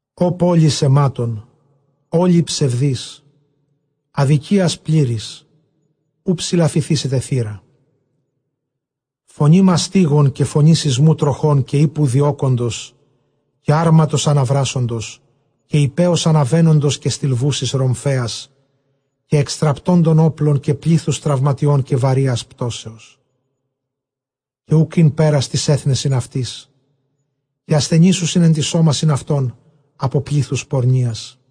Ὦ πόλις αἱμάτων, ὅλη ψευδὴς, ἀδικίας πλήρης, οὐ ψηλαφηθήσεται θήρα. Φωνὴ μαστίγων, καὶ φωνὴ σεισμοῦ τροχῶν, καὶ ἵππου διώκοντος, καὶ ἅρματος ἀναβράσσοντος, καὶ ἱππέως ἀναβαίνοντος, καὶ στιλβούσης ῥομφαίας, καὶ ἐξαστραπτόντων ὅπλων, καὶ πλήθους τραυματιῶν, καὶ βαρείας πτώσεως, καὶ οὐκ ἦν πέρας τοῖς ἔθνεσιν αὐτῆς· καὶ ἀσθενήσουσιν ἐν τοῖς σώμασιν αὐτῶν ἀπὸ πλήθους πορνείας·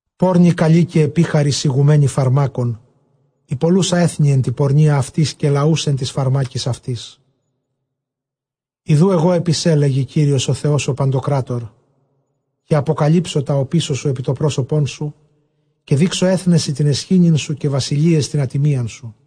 πόρνη καλὴ, καὶ ἐπίχαρις ἡγουμένη φαρμάκων, ἡ πωλοῦσα ἔθνη ἐν τῇ πορνείᾳ αὐτῆς, καὶ λαοὺς ἐν τοῖς φαρμάκοις αὐτῆς. Ἰδοὺ ἐγὼ ἐπὶ σὲ, λέγει Κύριος ὁ Θεὸς ὁ παντοκράτωρ, καὶ ἀποκαλύψω τὰ ὀπίσω σου ἐπὶ τὸ πρόσωπόν σου, καὶ δείξω ἔθνεσι τὴν αἰσχύνην σου, καὶ βασιλείαις τὴν ἀτιμίαν σου.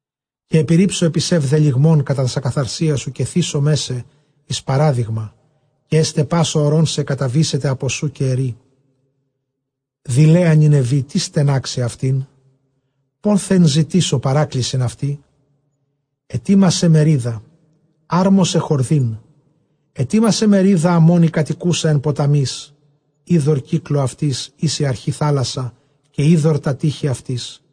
Καὶ ἐπιῤῥίψω ἐπὶ σὲ βδελυγμὸν κατὰ τὰς ἀκαθαρσίας σου, καὶ θήσομαί σε εἰς παράδειγμα. Καὶ ἔσται, πᾶς ὁ ὁρῶν σε καταβήσεται ἀπὸ σοῦ, καὶ ἐρεῖ, δειλαία Νινευή· τίς στενάξει αὐτήν; πόθεν ζητήσω παράκλησιν αὐτῇ; Ἑτοιμασὰι μερίδα, ἁρμόσαι χορδὴν, ἑτοιμάσαι μερίδα Ἀμμών· ἡ κατοικοῦσα ἐν ποταμοῖς, ὕδωρ κύκλῳ αὐτῆς, ἧς ἡ ἀρχὴ θάλασσα, καὶ ὕδωρ τὰ τείχη αὐτῆς,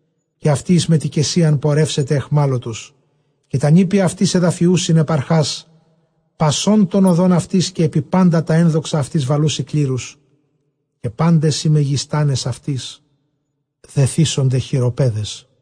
Καὶ αὐτὴ εἰς μετοικεσίαν πορεύσεται αἰχμάλωτος καὶ τὰ νήπια αὐτῆς ἐδαφιοῦσιν ἐπʼ ἀρχὰς πασῶν τῶν ὁδῶν αὐτῆς, καὶ ἐπὶ πάντα τὰ ἔνδοξα αὐτῆς βαλοῦσι κλήρους· καὶ πάντες οἱ μεγιστᾶνες αὐτῆς δεθήσονται χειροπέδαις.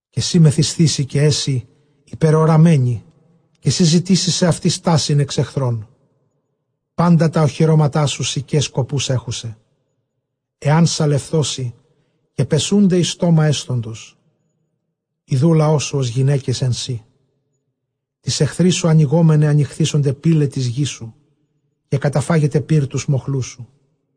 Καὶ σὺ μεθυσθήσῃ, καὶ ἔσῃ ὑπερεωραμένη, καὶ σὺ ζητήσεις σεαυτῇ στάσιν ἐξ ἐχθρῶν. Πάντα τὰ ὀχυρώματά σου συκαῖ σκοποὺς ἔχουσαι· ἐὰν σαλευθῶσι, πεσοῦνται εἰς στόμα ἔσθοντος. Ἰδοὺ ὁ λαός σου ὡς γυναῖκες ἐν σοὶ, τοῖς ἐχθροῖς σου ἀνοιγόμεναι ἀνοιχθήσονται πύλαι τῆς γῆς σου, καταφάγεται πῦρ τοὺς μοχλούς σου.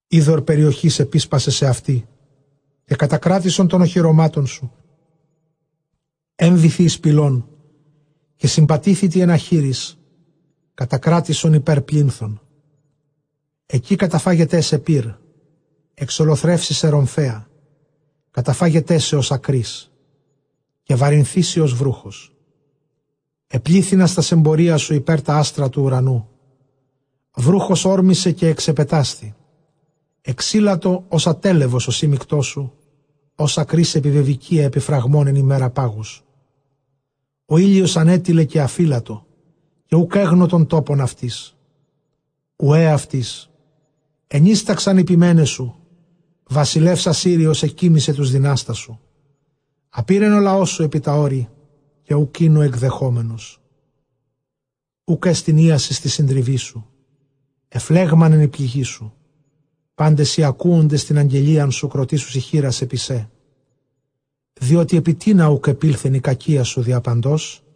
Ὕδωρ περιοχῆς ἐπίσπασαι σεαυτῇ, καὶ κατακράτησον τῶν ὀχυρωμάτων σου· ἔμβηθι εἰς πηλὸν, καὶ συμπατήθητι ἐν ἀχύροις, κατακράτησον ὑπὲρ πλίνθον. Ἐκεῖ καταφάγεταί σε πῦρ, ἐξολοθρεύσει σε ῥομφαία, καταφάγεταί σε ὡς ἀκρὶς, καὶ βαρυνθήσῃ ὡς βροῦχος. Ἐπλήθυνας τὰς ἐμπορίας σου ὑπὲρ τὰ ἄστρα τοῦ οὐρανοῦ· βροῦχος ὥρμησε, καὶ ἐξεπετάσθη. Ἐξήλατο ὡς ἀττέλεβος ὁ σύμμικτός σου, ὡς ἀκρὶς ἐπιβεβηκυῖα ἐπὶ φραγμὸν ἐν ἡμέρᾳ πάγους· ὁ ἥλιος ἀνέτειλε, καὶ ἀφήλατο, καὶ οὐκ ἔγνω τὸν τόπον αὐτῆς· οὐαὶ αὐτοῖς. Ἐνύσταξαν οἱ ποιμένες σου, βασιλεὺς Ἀσσύριος ἐκοίμισε τοὺς δυνάστας σου, ἀπῇρεν ὁ λαός σου ἐπὶ τὰ ὄρη, καὶ οὐκ ἦν ὁ ἐκδεχόμενος. Οὐκ ἔστιν ἴασις τῇ συντριβῇ σου, ἐφλέγμανεν ἡ πληγή σου, πάντες οἱ ἀκούοντες τὴν ἀγγελίαν σου κροτήσουσι χεῖρας ἐπὶ σέ· διότι ἐπὶ τίνα οὐκ ἐπῆλθεν ἡ κακία σου διαπαντός;